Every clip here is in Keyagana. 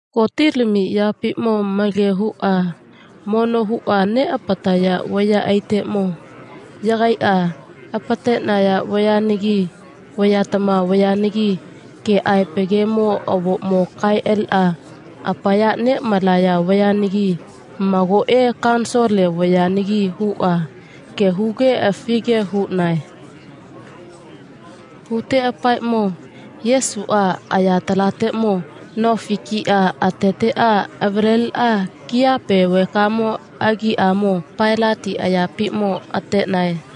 Gotilamiyapiʼmo malage huʼa mono huʼa neʼapataya vayaʼaiteʼmo yagaiʼa apateʼnaya vayanagi vayatama vayanagi keʼaepa gemo avoʼmo kaeʼa aliʼa apaya neʼmalaya vayanagi magoʼe kanisole vayanagi huʼa ge huge afige huʼnae. Huteʼapaeʼmo Yesuʼa ayatalateʼmo nofi kiʼa ateteʼa avaleliʼuʼa kiyape vekamo agiʼamo Pailati ayapiʼmo ateʼnae.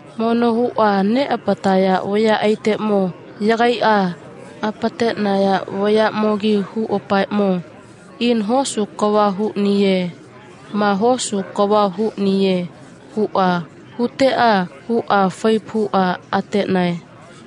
Mono huʼa neʼapataya vayaʼaiteʼmo yagaiʼa apateʼnaya vayaʼmogi huʼapaeʼmo, ina hosu kava huʼniye ma hosu kava huʼniye, huʼa huteʼa huʼa faipa huʼa ateʼnae.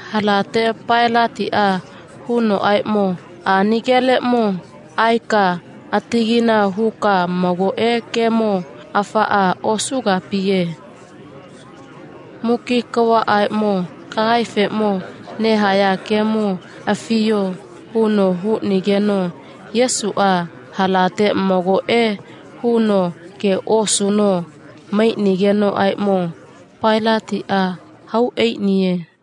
Halate Pailatiʼa hunoʼaeʼmo, ani geleʼmo aeka atagaina huka mago gemo afaʼa osugapiye. Muki kavaʼaeʼmo kagaefeʼmo nehaya gemo afiyo, huno huʼnigeno Yesuʼa halate magoʼe huno ge osuno maiʼnigenoʼaeʼmo Pailatiʼa hau aiʼniye.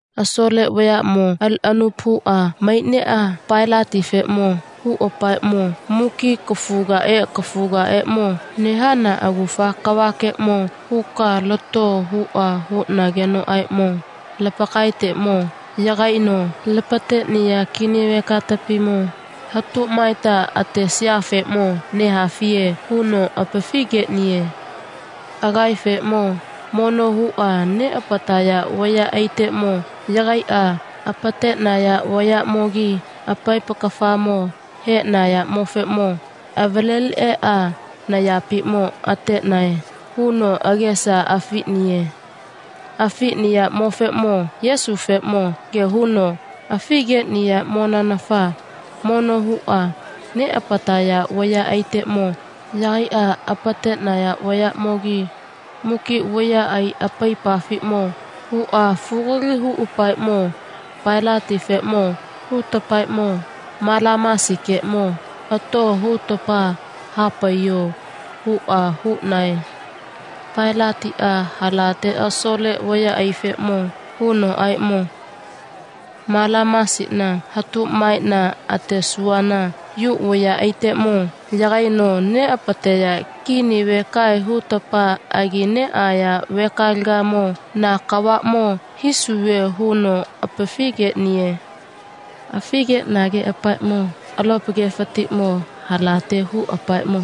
Asole vayaʼmo aliʼa anupa huʼa maiʼneʼa Pailatifeʼmo huʼapaeʼmo, muki kafugaʼae kafugaʼaeʼmo nehana agufa kavakeʼmo huka lato, huʼa huʼnagenoʼaeʼmo Lapakaeteʼmo yagaino lapateʼniya kini vekatapimo hatu maeta atesayafeʼmo nehafiye, huno apafi geʼniye. Agaefeʼmo mono huʼa neʼapataya vayaʼaiteʼmo yagaiʼa apateʼnaya vayaʼmogi apaipa kafamo haeʼnayaʼmofeʼmo avalaliʼeʼa nayapiʼmo ateʼnae, huno agesa afiʼniye. Afiʼniyaʼmofeʼmo Yesufeʼmo ge huno apafi geʼniyaʼmonanafa mono huʼa neʼapataya vayaʼaiteʼmo yagaiʼa apateʼnaya vayaʼmogi muki vayaʼai apaipafiʼmo huʼa fugali huʼapaeʼmo, Pailatifeʼmo hutapaeʼmo, Malamasikeʼmo ato, hutapa ha paiyo, huʼa huʼnae. Pailatiʼa halate asole vayaʼaifeʼmo hunoʼaeʼmo, Malamasina hatu maeʼna atesuvana Yu vayaʼaiteʼmo yagaino neʼapateya kini vekae hutapa agi neʼaya vekalegamo na kavaʼmo hisuve, huno apafi geʼniye. Apafi geʼnigeʼapaeʼmo alopa gefatiʼmo halate huʼapaeʼmo,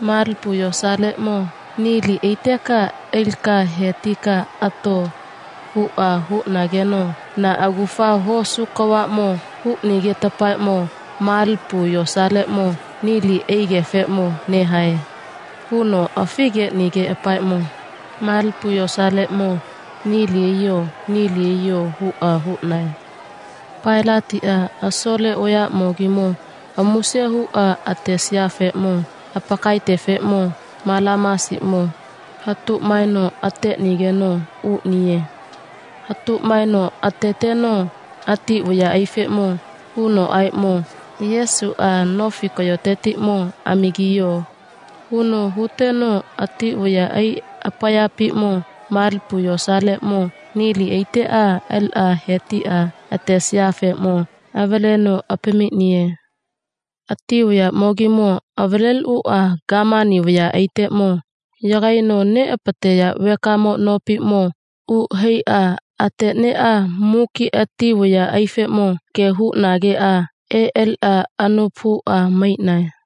malipu yosaleʼmo nili aiteka alika he tika ato, huʼa huʼnageno na agufa hosu kavaʼmo huʼnigetapaeʼmo malipu yosaleʼmo nili aigefeʼmo nehae, huno apafi geʼnigeʼapaeʼmo, malipu yosaleʼmo nili aiyo, nili aiyo, huʼa huʼnae. Pailatiʼa asole vayaʼmogimo amuse huʼa atesayafeʼmo apakaetefeʼmo Malamasiʼmo hatu maeno ateʼnigeno uʼniye. Hatu maeno ateteno ati vayaʼaifeʼmo hunoʼaeʼmo, Yesuʼa nofi kayotetiʼmo amagiyo, huno huteno ati vayaʼai apayapiʼmo malipu yosaleʼmo nili aiteʼa aliʼa he tiʼa atesayafeʼmo avaleno apamiʼniye. Ati vayaʼmogimo avaleliʼuʼa gamani vayaʼaiteʼmo yagaino neʼapateya vekamo nopiʼmo uʼa haiʼa ateʼneʼa muki ati vayaʼaifeʼmo ge huʼnageʼa eʼa aliʼa anupa huʼa maiʼnae.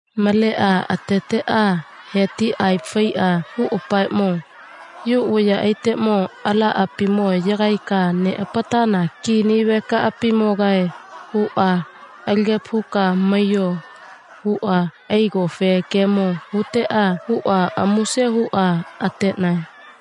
Maleʼa ateteʼa he tiʼa aepa faiʼa huʼapaeʼmo, Yu vayaʼaiteʼmo alaʼapimo yagaika neʼapatana kini vekaʼapimogae, huʼa, Alagepa huka maiyo, huʼa aigofe gemo huteʼa huʼa amuse huʼa ateʼnae.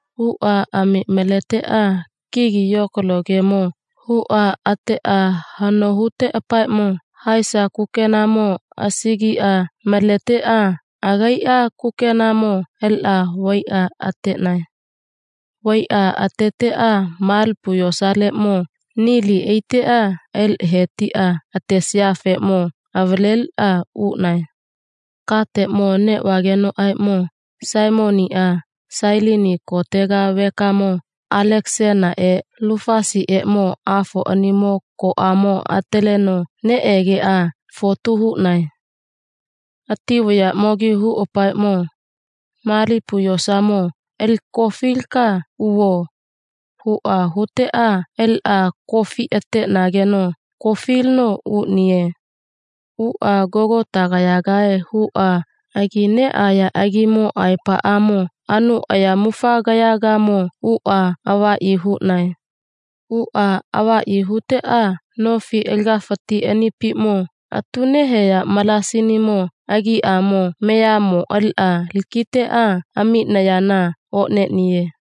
Huʼa ami maleteʼa kigi yokalo gemo huʼa ateʼa hano huteʼapaeʼmo haesa kukenamo asagiʼa maleteʼa agaiʼa kukenamo aliʼa vaiʼa ateʼnae. Vaiʼa ateteʼa malipu yosaleʼmo nili aiteʼa aliʼa he tiʼa atesayafeʼmo avaleliʼa uʼnae. Kateʼmo neʼvagenoʼaeʼmo Saimoniʼa Sailini kotega vekamo Alekasanaʼe Lufasiʼeʼmo afoʼanimo koʼamo ataleno neʼegeʼa fotu huʼnae. Ati vayaʼmogi huʼapaeʼmo, malipu yosamo alika kofilika uvo, huʼa huteʼa aliʼa kofiʼa ateʼnageno kofilino uʼniye. Uʼa Gogatagayagae huʼa agi neʼaya agimo aepaʼamo anu ayamufagayagamo uʼa avaʼyi huʼnae. Uʼa avaʼyi huteʼa nofi alagafati anipiʼmo atu neheya malasinimo agiʼamo meamo aliʼa lakiteʼa amiʼnayana oʼneʼniye.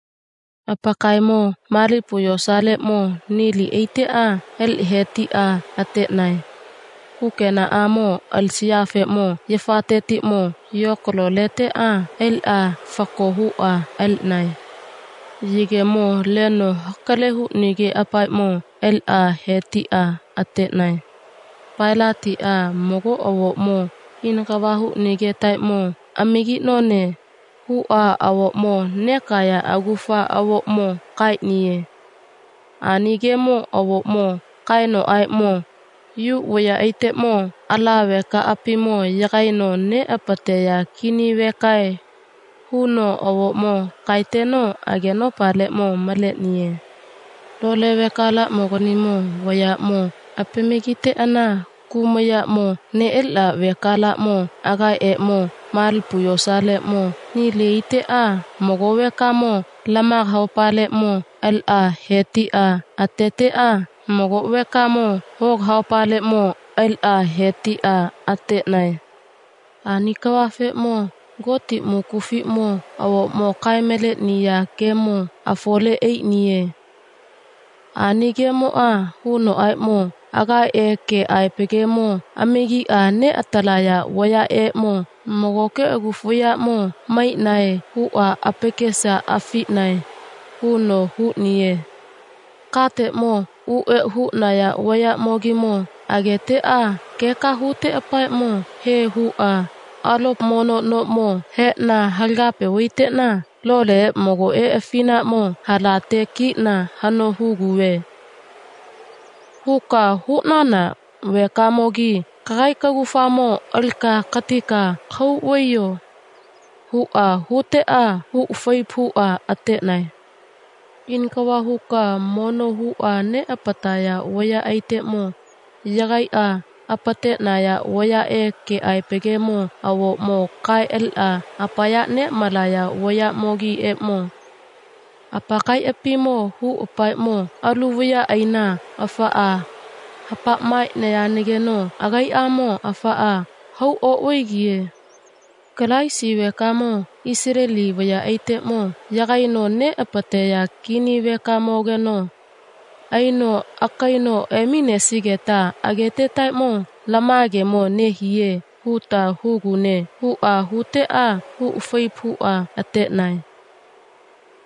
Apakaemo malipu yosaleʼmo nili aiteʼa aliʼa he tiʼa ateʼnae. Kukenaʼamo alisayafeʼmo yafatetiʼmo yokalo leteʼa aliʼa fako huʼa aliʼnae. Yegemo leno hakale huʼnigeʼapaeʼmo aliʼa he tiʼa ateʼnae. Pailatiʼa mago avoʼmo ina kava huʼnigetaeʼmo amagiʼnone, huʼa avoʼmo nekaya agufa avoʼmo kaeʼniye. Ani gemo avoʼmo kaenoʼaeʼmo, Yu vayaʼaiteʼmo ala vekaʼapimo yagaino neʼapateya kini vekae, huno avoʼmo kaeteno agenopaleʼmo maleʼniye. Lole vekalaʼmoganimo vayaʼmo apamagiteʼana kumayaʼmo neʼaliʼa vekalaʼmo agaeʼeʼmo malipu yosaleʼmo nili aiteʼa mago vekamo lamaga haopaleʼmo aliʼa he tiʼa ateteʼa mago vekamo hoga haopaleʼmo aliʼa he tiʼa ateʼnae. Ani kavafeʼmo Goti mukufiʼmo avoʼmo kae maleʼniya gemo afole aiʼniye. Ani gemoʼa hunoʼaeʼmo, agaeʼe keʼaepa gemo amagiʼa neʼatalaya vayaʼeʼmo magoke agufa vayaʼmo maiʼnae, huʼa apakesa afiʼnae, huno huʼniye. Kateʼmo u eʼa huʼnaya vayaʼmogimo ageteʼa keka huteʼapaeʼmo, he, huʼa, alopa mono noʼmo heʼna halagape vaiteʼna loleʼe magoʼe afinaʼmo halate kiʼna hano huguve, huka huʼnana vekamogi kagaika kagufamo alika katika kahau vaiyo, huʼa huteʼa huʼa faipa huʼa ateʼnae. Ina kava huʼa mono huʼa neʼapataya vayaʼaiteʼmo yagaiʼa apateʼnaya vayaʼe keʼaepa gemo avoʼmo kaeʼa aliʼa apaya neʼmalaya vayaʼmogiʼeʼmo apakaiʼapimo huʼapaeʼmo, alu vayaʼaina afaʼa hapa maeʼniyanageno agaiʼamo afaʼa hau oʼvaigiye. Kalaisi vekamo Isaleli vayaʼaiteʼmo yagaino neʼapateya kini vekamogeno aino akaino eminesigeta agetetaeʼmo lama gemo nehiye, huta hugune, huʼa huteʼa huʼa faipa huʼa ateʼnae.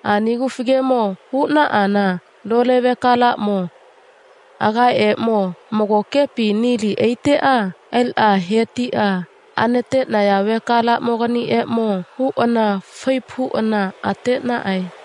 Ani agufa gemo huʼana lole vekalaʼmo agaeʼeʼmo magokepi nili aiteʼa aliʼa he tiʼa anateʼnaya vekalaʼmoganiʼeʼmo huʼana faipa huʼana ateʼnaʼae.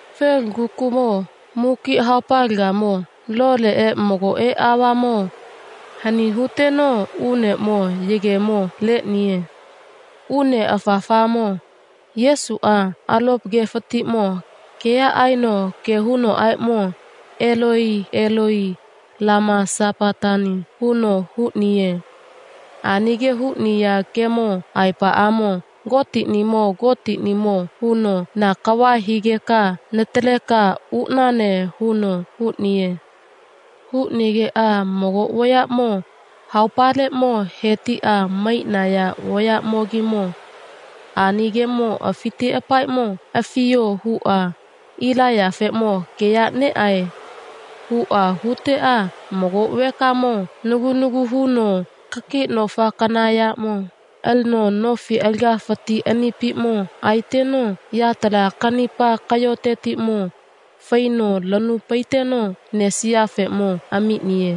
Felugakukuʼmo muki haopalegamo loleʼe magoʼe aovamo hani huteno uneʼmo yegemo leʼniye. Une afafamo Yesuʼa alopa gefatiʼmo keya aeno ge hunoʼaeʼmo, Eloi, Eloi lama samakatani, huno huʼniye. Ani ge huʼniya gemo aepaʼamo Gotiʼnimo, Gotiʼnimo, huno, na kava higeka nataleka uʼnane, huno huʼniye. Huʼnigeʼa mago vayaʼmo haopaleʼmo he tiʼa maiʼnaya vayaʼmogimo ani gemo afiteʼapaeʼmo, Afiyo, huʼa, Ilaiyafeʼmo keya neʼae, huʼa huteʼa mago vekamo nagu nagu hununo kakiʼnofikana yaʼmo alino nofi alagafati anipiʼmo aeteno yatala kanipa kayoteʼmo faino lanu paiteno nesiyafeʼmo amiʼniye.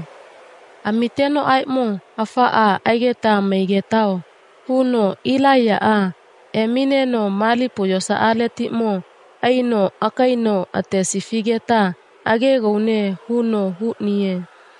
Amitenoʼaeʼmo, afaʼa ageta maigetao, huno, Ilaiyaʼa emineno malipu yosaletiʼmo aino akaino atesifigeta agegaune, huno huʼniye.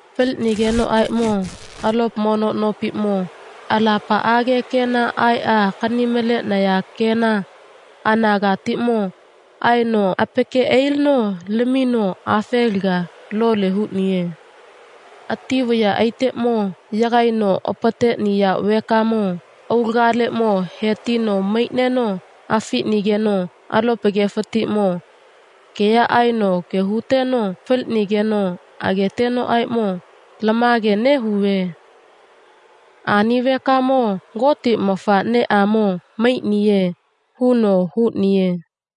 Faliʼnigenoʼaeʼmo alopa mono nopiʼmo alapaʼage kena aeʼa akani maleʼnaya kena anagatiʼmo aeno apake ailino lamino afelaga lole huʼniye. Ati vayaʼaiteʼmo yagaino apateʼniya vekamoʼmo aulagaleʼmo he tino maiʼneno afiʼnigeno alopa gefatiʼmo keya aeno ge huteno faliʼnigeno agetenoʼaeʼmo, lama ge nehuve. Ani vekamo Goti mafaʼneʼamo maiʼniye, huno huʼniye.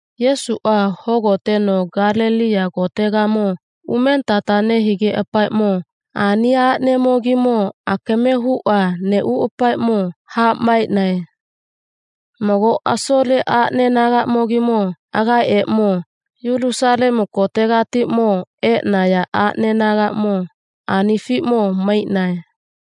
Yesuʼa hogoteno Galeliya kotegamo umenitata nehigeʼapaeʼmo ani aʼnemogimo akame huʼa neʼuʼapaeʼmo ha maeʼnae. Mago asole aʼne anagamo agaeʼeʼmo Yulusalemu kotegatiʼmo eʼnaya aʼneʼeʼmo anifiʼmo maiʼnae.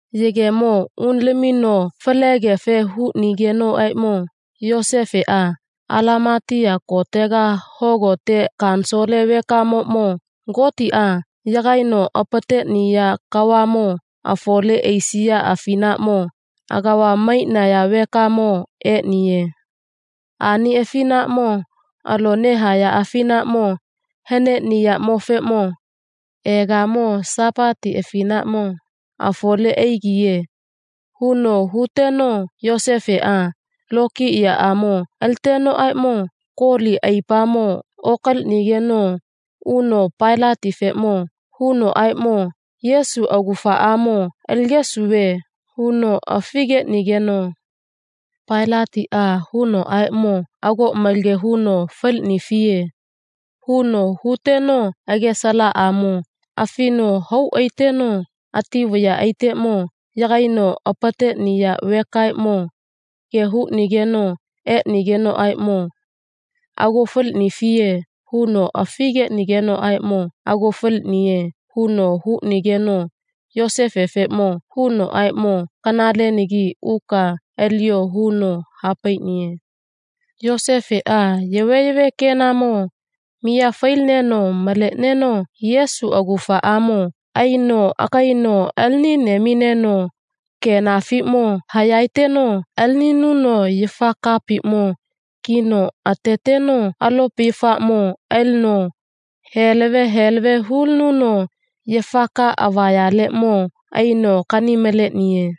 Yegemo uno lamino falegefe huʼnigenoʼaeʼmo Yosefeʼa Alamatiya kotega hogote kanisole vekamoʼmo Gotiʼa yagaino apateʼniya kavaʼmo afole aisiya afinafeʼmo agava maiʼniya vekamo eʼniye. Ani afinaʼmo alo nehaya afinaʼmo haneʼniyaʼmofeʼmo egamo Sapati afinaʼmo afole aigiye, huno huteno Yosefeʼa lokiyaʼamo alitenoʼaeʼmo koli aipamo okaliʼnigeno uno Pailatifeʼmo hunoʼaeʼmo, Yesu agufaʼamo aligesuve, huno afi geʼnigeno Pailatiʼa hunoʼaeʼmo, ago malage huno faliʼnifiye, huno huteno agesa alaʼamo afino hau aiteno ati vayaʼaiteʼmo yagaino apateʼniya vekaeʼmo ge huʼnigeno eʼnigenoʼaeʼmo, ago faliʼnifiye, huno afi geʼnigenoʼaeʼmo, ago faliʼniye, huno huʼnigeno Yosefefeʼmo hunoʼaeʼmo, kanalenagi uka aliyo, huno ha paiʼniye. Yosefeʼa yaveyave kenamo miya failineno maleʼneno Yesu agufamo aino akaino alinine emineno kenafiʼmo hayaeteno alininuno yafa kapiʼmo kino ateteno alopa yafaʼmo alino heleve heleve hulinuno yafa ka avayaleʼmo aino akani maleʼniye.